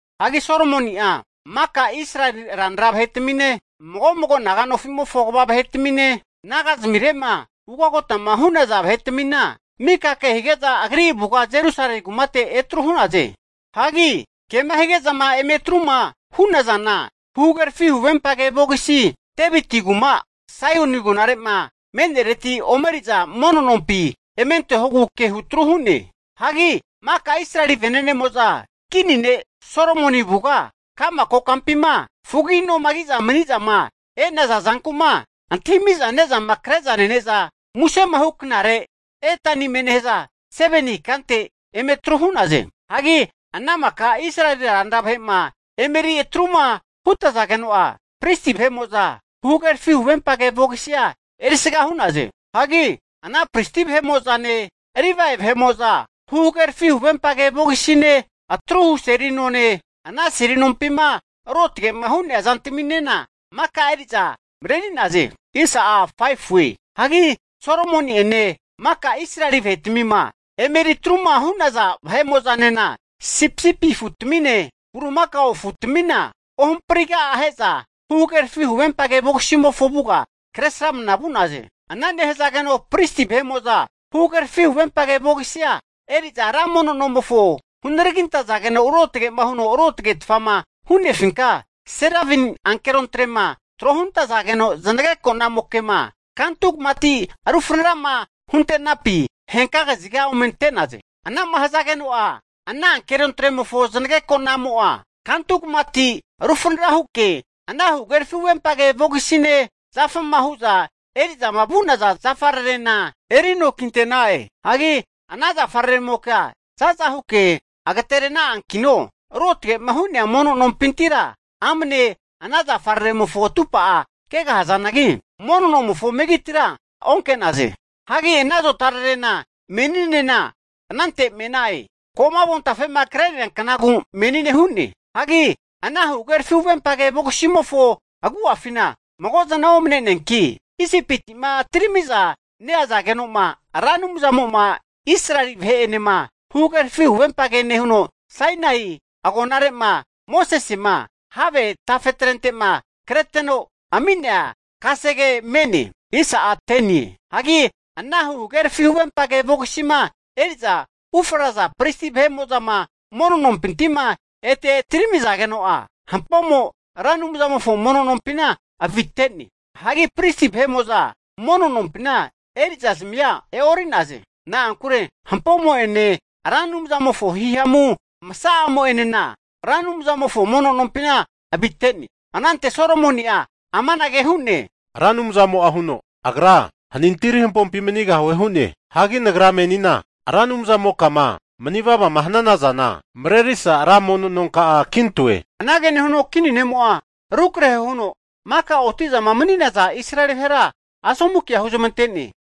Hagi Solomoni'a maka Israeli ranra vahe'tamine, mago mago naga'nofimofo kva vahe'tamine, nagazamire'ma ugagotama hu'naza vahetamina mika kehige'za agri avuga Jerusalemi kumate etru hu'naze. Hagi ke'ma hige'zama eme atru'ma hu'nazana, huhagerafi huvempage vogisi Deviti rankuma Saioni agonare'ma me'nereti omeri'za ra mono nompi eme antehogu kehu tru hu'ne. Hagi maka Israeli vene'nemo'za kini ne' Solomoni avuga ka'ma kokampima fugagi'noma ki'za mani'zama e'naza zanku'ma antahimi'za ne'zama kre'za nene'za musemahu knare Etanimie nehaza 7ni ikante, eme atru hu'naze. Hagi ana maka Israeli ranra vahe'ma emeri atruma hutazageno'a, pristi vahe'mo'za huhagerafi huvempage vogisia erisga hu'naze. Hagi ana pristi vahe'mo'zane, Livae vahe'mo'za huhagerafi huvempage vogisine, atruhu seli none, ana seli nompima ruotge'ma hu'nea zantaminena maka eri'za mareri'naze. Hagi Solomoni'ene maka Israeli vahetmima emeri atruma hu'naza vahe'mo'zanena sipisipi afutamine, bulimakao afutamina ohampriga'a ahe'za huhagerafi huvempage vogisimofo avuga kresramna vu'naze. Ana nehazageno pristi vahe'mo'za huhagerafi huvempage vogisia eri'za, ra mono nomofo hunaragintazageno ruotge'ma huno ruotagetfama hu'nefinka serabimi ankerontrema tro huntazageno zanageko'namoke'ma kantu kamati rufanara huntenapi henka kaziga ome ante'naze. Ana'ma hazageno'a, ana ankerontremofo zanageko'namo'a kantu kamati rufanara huke ana huhagerafi huvempage vogisine, zafama hu'za eri'zama vu'naza zafararena refitente'na'e. Hagi ana zafararemokea za'za huke agaterena'ankino ruotge'ma hu'nea mono nompintira amne ana zafararemofo atumpa kegahazanagi, mono nomofo megitira onke'naze. Hagi ana zotararena meninena anante me'na'e. (Ko'ma avontafema kre'nea knagu menine hu'ne). Hagi ana huhagerafi huvempage vogisimofo agu'afina mago zana omane'neanki, Isipiti'ma atirami'za neazageno'ma, Ra Anumzamo'ma Israeli vahe'enema huhagerafi huvempage nehuno, Sainai (Horepi) agonare'ma Mosesema have tafetrente'ma kreteno ami'nea kasege me'ne. Hagi ana huhagerafi huvempage vogisima eri'za ufraza pristi vahe'mo'zama hunaragintageno ruotge'ma hu'nea mono nompinti'ma ete atiramizageno'a, hampomo Ra Anumzamofo mono nompina avite'ne. Hagi pristi vahetmimo'za mono nompina eri'zazmia e'ori'naze. Na'ankure hampomo'ene Ra Anumzamofo hihamu masa'amo'enena Ra Anumzamofo mono nompina avite'ne. Anante Solomoni'a amange hu'ne, Ra Anumzamo'a huno, Agra hanintiri hampompi manigahue hu'ne. Hagi nagra menina Ra Anumzamokama mani vavama hanana zana marerisa ra mono nonka'a kintoe. Anage nehuno kini ne'mo'a rukrahe huno, maka oti'zama mani'naza Israeli vahera asomu kea huzmante'ne.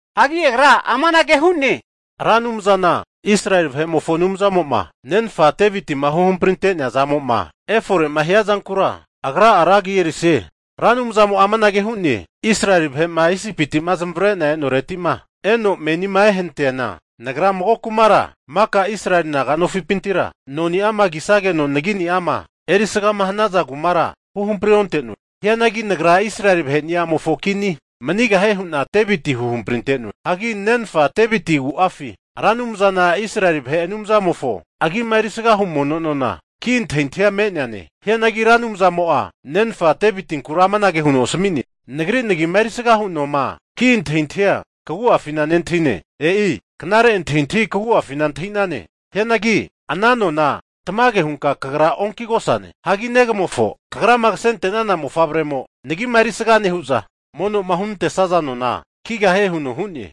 Hagi agra amanage hu'ne, Ra Anumzana Israeli vahe'mofo Anumzamo'ma nenfa Devitima huhamprinte'nea zamo'ma efore'ma hiazankura Agra'a ra agi erisie. Ra Anumzamo'a amanage hu'ne, Israeli vahe'ma Isipiti'ma zamavare'na e'noreti'ma eno menima ehanatiana, Nagra mago kumara maka Israeli naga nofipintira noni'ama kisageno nagi'ni'ama erisgama hanaza kumara huhampri onte'noe. Hianagi Nagra Israeli vahe'niamofo kini manigahie hu'na Deviti huhamprinte'noe. Hagi nenfa Deviti agu'afi Ra Anumzana Israeli vahe Anumzamofo agi'ma erisgahu mono noma ki' antahintahia me'neane. Hianagi Ra Anumzamo'a nenfa Devitinkura amanage huno asami'ne, Nagri nagima erisgahu noma ki' antahintahia kagua'afina nentahine. E'i knare antahintahi kagu'afina antahi'nane. Hianagi ana nona tamage hunka kagra onkigosane. Hagi negamofo, kagrama kasente'nana mofavremo nagima erisga nehu'za, mono'ma hunantesaza nona kigahie huno hu'ne.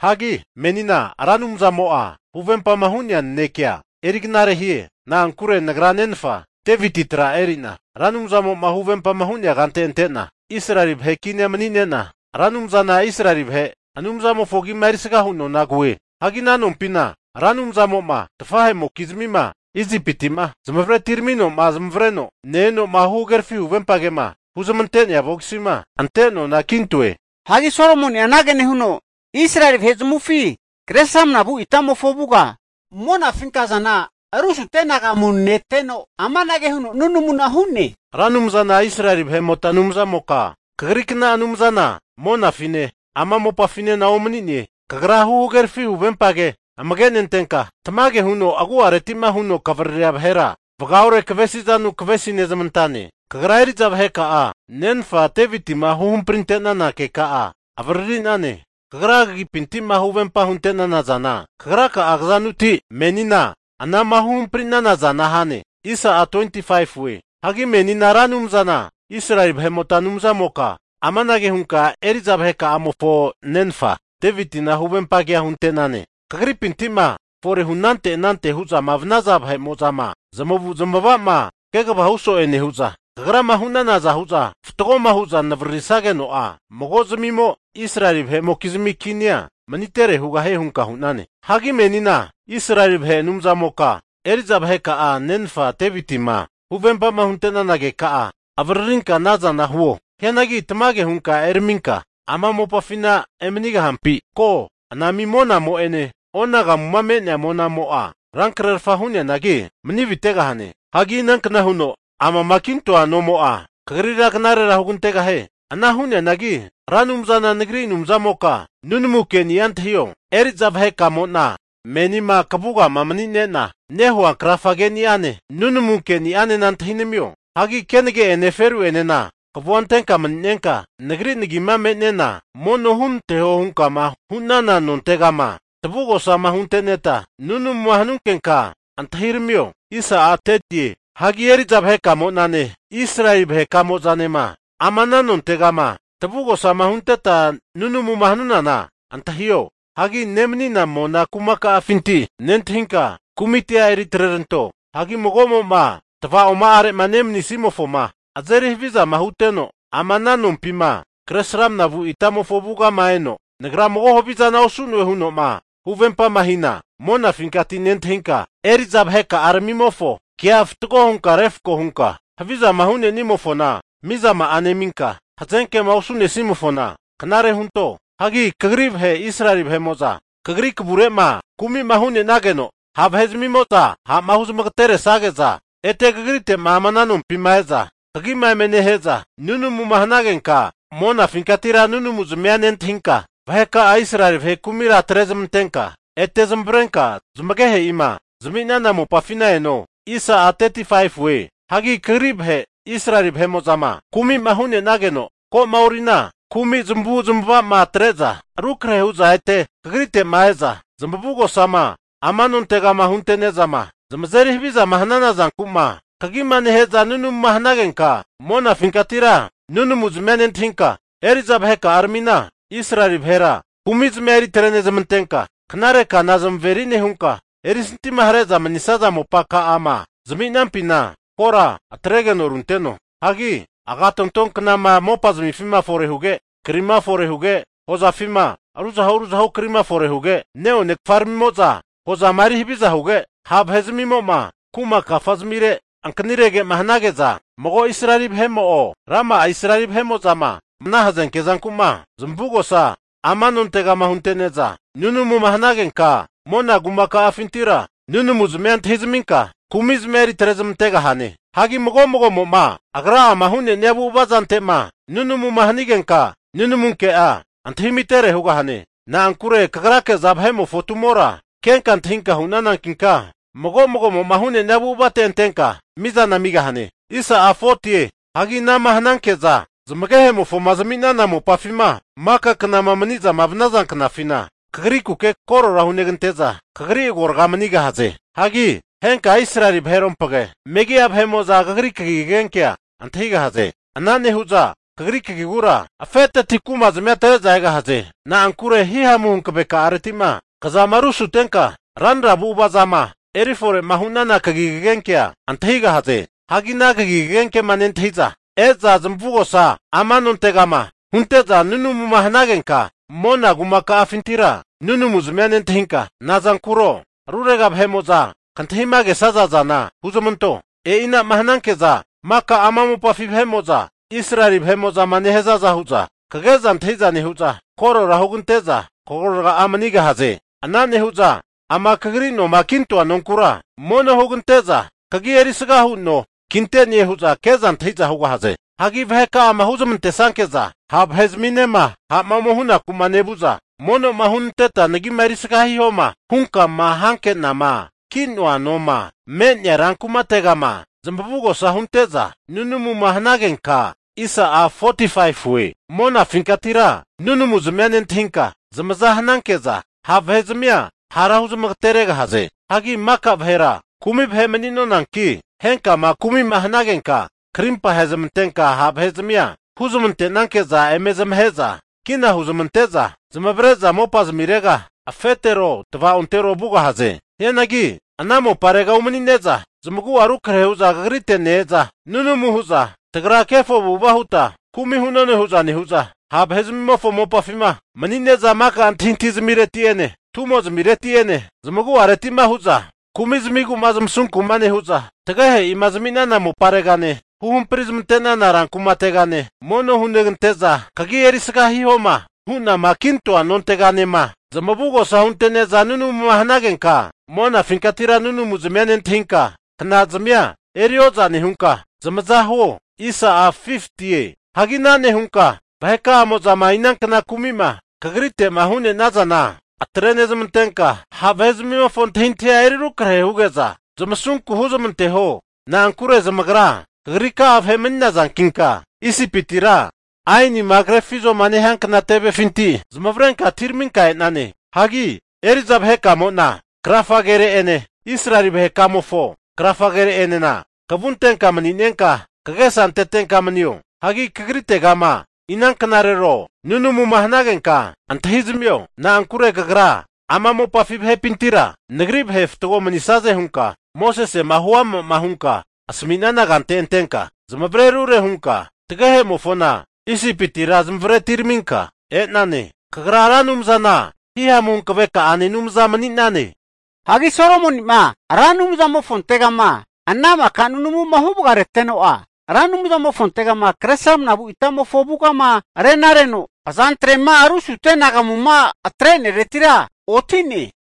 Hagi menina Ra Anumzamo'a huvempama hu'nea nanekea eri knare hie. Na'ankure nagra nenfa Deviti tra eri'na Ra Anumzamo'ma huvempama hu'nea kante ante'na, Israeli vahe kinia mani'nena Ra Anumzana Israeli vahe Anumzamofo agi'ma erisgahu nona kue. Hagi ana nompina Ra Anumzamo'ma tafahe'mokizmima Isipiti'ma zamavare atiramino zamavareno ne-eno'ma huhagerafi huvempa kema huzmante'nea vogisima ante nona kintoe. Hagi Solomoni'a anage nehuno, Israeli vahe zamavufi kre sramnavu itamofo avuga monafinka azana rusute anagamu neteno, amanage huno nunamuna hu'ne, Ra Anumzana Israeli vahe'mota Anumzamoka kagri kna Anumzana monafine, ama mopafinena omani'ne. Kagra huhagerafi huvempage amage nentenka, tamagema huno agu'areti'ma huno kavariria vahera vagaore kavesizanu kavesi nezamantane. Kagra eri'za vaheka'a nenfa Devitima huhamprinte'nana keka'a avariri'nane. Kagra kagipinti'ma huvempa hunte'nana zana, kagra'a kazanuti menina anama huhampri'nana zana hane. Hagi menina Ra Anumzana Israeli vahe'mota Anumzamoka amanage hunka eri'za vaheka'amofo nenfa Devitina huvempagea hunte'nane, kagripinti'ma forehu anante anante hu'zama vanaza vahe'mo'zama zamavu'zamavama kegava hu so'e nehu'za, kagrama hu'nanaza hu'za fatgoma hu'za navaririsageno'a, mago'zimimo Israeli vahe'mokizmi kinia manitere hugahie hunka hu'nane. Hagi menina Israeli vahe Anumzamoka eri'za vaheka'a nenfa Devitima huvempama hunte'nana keka'a avaririnka ana zana huo. Hianagi tamage hunka eraminka ama mopafina emanigahampi? Ko, anami monamo'ene onagamuma me'nea monamo'a rankrerafa hu'neangi mani avitegahane. Hagi inankna huno amama kintoa nomo'a kagrira knarera hugantegahie? Ana hu'neanagi Ra Anumzana nagri Anumzamoka nunamu keni'a antahio. Eri'za vaheka'amo'na menima kavugama mani'nena nehua krafa keni'ane, nunamu keni'anena antahinamio. Hagi kenage'ene feru'enena kavua antenka mani'nenka, Nagri nagi me'nena mono hunanteho hunkama hu'nana nontegama tavugosama hunteneta nunamuma hanunkenka antahiramio. Hagi eri'za vahe'kamo'nane, Israeli vahekamozanema ama ana nontegama tavugosama hunteta nunamuma hanunana antahio. Hagi nemanina mona kumaka'afinti nentahinka kumitia eri atreranto. Hagi mago'mo'ma tavaoma'are'ma nemanisimofoma azeri havizama huteno, ama ana nompima kresramna vu itamofo avugama eno, nagra mago havizana osu'noe huno'ma huvempama hina, monanfinkati nentahinka eri'za vaheka'aramimofo kea fatgo hunka refko hunka, havizama hu'nenimofona mizama'a neminka, hazenkema osu'nesimofona knare hunto. Hagi kagri vahe Israeli vahe'mo'za kagri kavure'ma kumi'ma hu'nenageno ha' vahe'zmimo'za ha'ma huzmagateresage'za ete kagrite'ma ama ana nompima e'za kagima eme nehe'za nunumuma hanagenka, monafinkatira nunamuzmia nentahinka vaheka'a Israeli vahe kumira atre'zmantenka ete zamavarenka zamagehe'ima zami'nana mopafi eno. Hagi kagri vahe Israeli vahe'mo'zama kumi'ma hu'nenageno, ko'ma orina kumi zamavu'zmavama atre'za rukrehe hu'za ete kagrite'ma e'za zamavugosama ama nontegama hunte'nezama zamazeri havizama hanana zanku'ma kagima nehe'za nunamuma hanagenka, monafinkatira nunanuzmia nentahinka eri'za vaheka'aramina Israeli vahera kumizmia eri atre'nezmantenka, knare kana zamaveri nehunka, erisantima hare'za manisaza mopa ka'ama zami'nampina kora atregeno runteno. Hagi agatonto knama mopazmifima fore huge, krima fore huge, hozafima ruzahu ruzahu kri fore huge, neone kafaramimo'za hozama eri havizama huge, ha' vahe'zmimo kuma kafazamire ankanirege'ma hanage'za, mago Israeli vahemo'o, rama'a Israeli ma ana hazenke zanku'ma zamavugosa ama nontegama hunente'za nunamuma hanagenka, mona kuma ka'afintira nunamuzmia antahizaminka kumizmia eri atre zamantegahane. Hagi mago mago'mo'ma agra'ama hu'nenia avu'ava zante'ma nunamuma hanigenka nunamu ke'a antahimitere hugahane. Na'ankure Kagrake'za vahe'mofo tumora kenka antahinka hu'nanankinka, mago mago'mo'ma hu'nenia avu'avate antenka mizana amigahane. Hagi ana'ma hananke'za zamagehemofoma zami'nana mopafima maka knama mani'zama vanaza knafina, kagrikuke korora hunegante'za, kagri agorga manigahaze. Hagi henka Israeli vaherompage megi'a vahe'mo'za kagri kagi kagenkea antahigahaze. Ana nehu'za Kagri kagigura afeteti kumazmia atre'za egahaze. Na'ankure hihamu hanavekareti'ma kzama rusutenka ranra avu'avazama erifore'ma hu'nana kagi kagenkea antahigahaze. Hagi ana kagi kagenkema nentahiza e'za zamavugosa ama nontegama hunte'za nunamuma hanagenka, mona kuma ka'afintira nunamuzmia nentahinka, nazankuro rurega vahe'mo'zama kantahima kesaza zana huzmanto. E'ina'ma hananke'za, maka ama mopafi vahe'mo'za, Israeli vahe'mo'zama nehazaza hu'za kage'za antahi'za nehu'za, korora hunegante'za kagorga'a manigahaze. Ana nehu'za ama kagri noma kintoa nonkura, mono hugante'za kagi erisga hu no kinte'ne hu'za ke'za antahi'za hugahaze. Hagi vaheka'ama huzamantesanke'za ha' vahe'zaminema ha'ma ome hunaku'ma nevu'za, mono'ma hunanteta nagima erisga hihoma hunkama hanke'nama ki'noa noma me'nea rankumategama zamavugosa hunte'za nunamuma hanagenka, monafinkatira nunamuzmia nentahinka zamaza hananke'za, ha' vahe'zmia hara huzmagateregahaze. Hagi maka vahera kumi vahe mani'nonanki, henkama kumi'ma hanagenka krimpa ahezmantenka ha' vahe'zmia huzmante'nanke'za eme zamahe'za kina huzmante'za zamavare'za mopazmirega afetero tava'ontero vugahaze. Hianagi ana moparega umani'ne'za zamagu'a rukrahe hu'za kagrite ne-eza, nunamu hu'za tagra kefo avu'ava huta, kumi hu'none hu'za nehu'za, ha' vahe'zmimofo mopafima manine'za maka antahintahi zamireti'ene, tumozmireti'ene, zamagu'areti'enema hu'za kumi zamigu'ma zamasunku'ma nehu'za, tagehe'ima zami'nana moparegane, huhampri zmante'nana rankumategane, mono hunegante'za kagi erisga hihoma hu'nama kintoa nonteganema zamavugosa hunte'ne'za nunamuma hanagenka, monafinkatira nunamuzmia nentahinka, knazazmia eri oza nehunka zamaza huo. Hagi ana nehunka vaheka'amo'zama inankna kumi'ma kagrite'ma hu'nenazana kumizamia atre'nezmantenka, ha' vahe'zamimofo antahintahia eri rukrahe huge'za, zamasunku huzmanteho. Na'ankure zamagra kagrika'a vahe mani'nazankinka Isipitira aenima krefizoma nehiankna tevefinti zamavarenka atiraminka e'nane. Hagi eri'za vahe'kamona krafa kere'ene Israeli vahe'ka'amofo krafa kere'enena, kavu antenka mani'nenka kagesa antetenka manio. Hagi kagritegama inanknarero nunamuma hanagenka antahizamio. Na'ankure kagra ama mopafi vahe'pintira nagri vahe fatgo manisaze hunka, Mosesema huama'ma hunka asami'nana kante antenka zamazerinte ruotge hunka tagehe'mofoma Isipitira zamavare atiraminka e'nane. Kagra Ra Anumzana hihamu hankavekane Anumza mani'nane. Hagi Solomoni'ma Ra Anumzamofontegama ana maka nunamuma huvagareteno'a, Ra Anumzamofontegama kre sramnavu itamofo avugama rena reno azantre'ma rusute anagamuma atre'neretira oti'ne.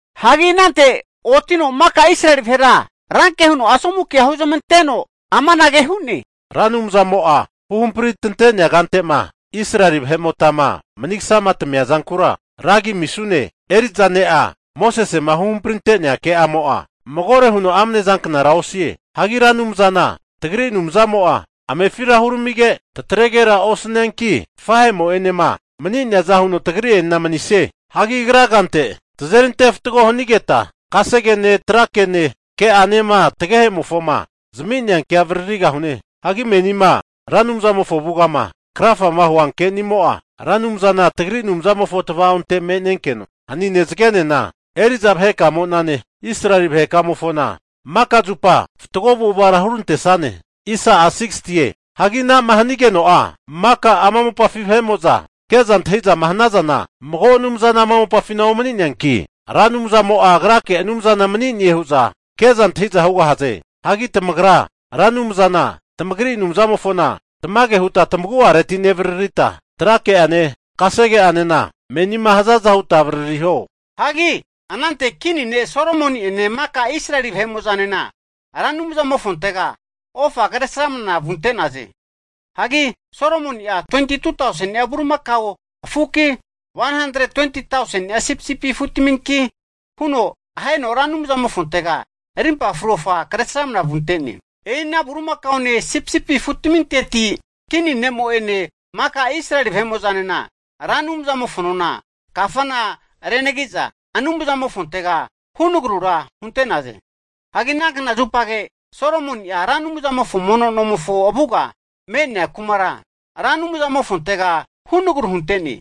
Hagi anante otino maka Israeli vahera ranke huno asomu kea huzmante'no amanage hu'ne, Ra Anumzamo'a huhampri tante'nea kante'ma Israeli vahe'motama manigasama tamia zankura ragi amisune. Eri'za ne'a Mosesema huhamprinte'nea ke'amo'a magore huno amnezanknara osie. Hagi Ra Anumzana tagri Anumzamo'a amefira huramige, tatregera osanianki, tafahe'mo'enema mani'neaza huno tagri'enena manisie. Hagi agra kante tazeri ante fatgo hanigeta kasegene, trakene ke'anema tagehe'mofoma zami'nea kea avaririgahune. Hagi menima Ra Anumzamofo avugama krafama hua nunamu ke'ni'amo'a Ra Anumzana tagri Anumzamofo tava'onte me'nenkeno, hanine, zagenena eri'za vahekamo'nane Israeli vahe'kamofona maka zupa fatgo avu'avara hurantesane. Hagi ana'ma hanigeno'a maka ama mopafi vahe'mo'za ke'za antahi'zama hanazana, mago Anumzana ama mopafina omani'neanki Ra Anumzamo'a agrake Anumzana mani'nie hu'za ke'za antahiza hugahaze. Hagi tamagra Ra Anumzana tamagri Anumzamofona tamage huta tamagu'areti nevaririta trake'ane, kasege'anena menima hazaza huta avaririho. Hagi anante kini ne' Solomoni'ene maka Israeli vahe'mo'zanena Ra Anumzamofontega ofa kresramna vunte'naze. Hagi Solomoni'a 22tauseni'a bulimakao afuki, 120tauseni'a sipisipi afutminki huno aheno Ra Anumzamofontega rimpa fru ofa kresramna vunte'ne. E'ina bulimakaone sipisipi afutminteti kini ne'mo'ene maka Israeli vahe'mo'zanena Ra Anumzamofo nona kafana renagiza, Anumzamofontega hunagrura hunte'naza ami vagarenaze. Hagi ana kna zupage Solomoni'a Ra Anumzamofo mono nomofo avugama me'nea kumara Ra Anumzamofontega hunagru hunteno ami vagare'ne.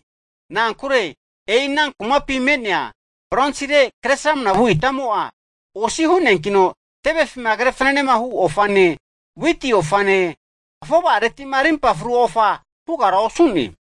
Na'ankure e'ina kumapi me'nea bronsire kre sramnavu itamo'a osi hu'neankino tevefima kre fananehu ofane, witi ofane, afova'aretima arimpa fru ofa hugara osu'ne.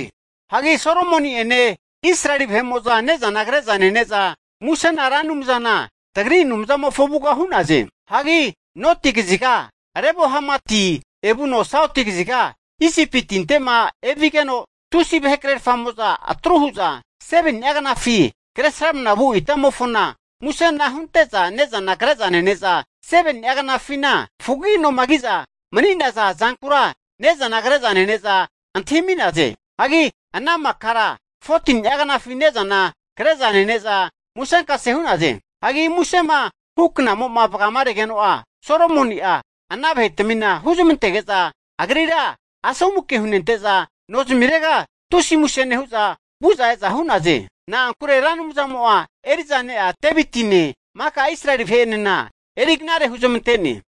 Hagi Solomoni'ene Israeli vahe'mo'za ne'zana kre'za nene'za musena Ra Anumzana tagri Anumzamofo avuga hu'naze. Hagi noti kaziga Lebo-hamatiti evuno sauti kaziga Isipi tinte'ma evigeno, tusi vahekrerfamo'za atru hu'za 7ni'a knafi kre sramnavu itamofona musena hunte'za ne'zana kre'za nene'za, 7ni'a knafina ko'ma fugagi noma ki'za mani'za e'naza zankura ne'zana kre'za nene'za antahimi'naze. Hagi ana makara 14ni'a knafi ne'zana kre'za nene'za musenkase hu'naze. Hagi musema hu knamo'ma vagaregeno'a Solomoni'a ana vahe'tmina huzmantege'za agrira asomuke hunente'za nozmirega tusi muse nehu'za vu'za e'za hu'naze. Na'ankure Ra Anumzamo'a eri'za ne'a Devitine, maka Israeli vahe'enena eri knare huzmante'ne.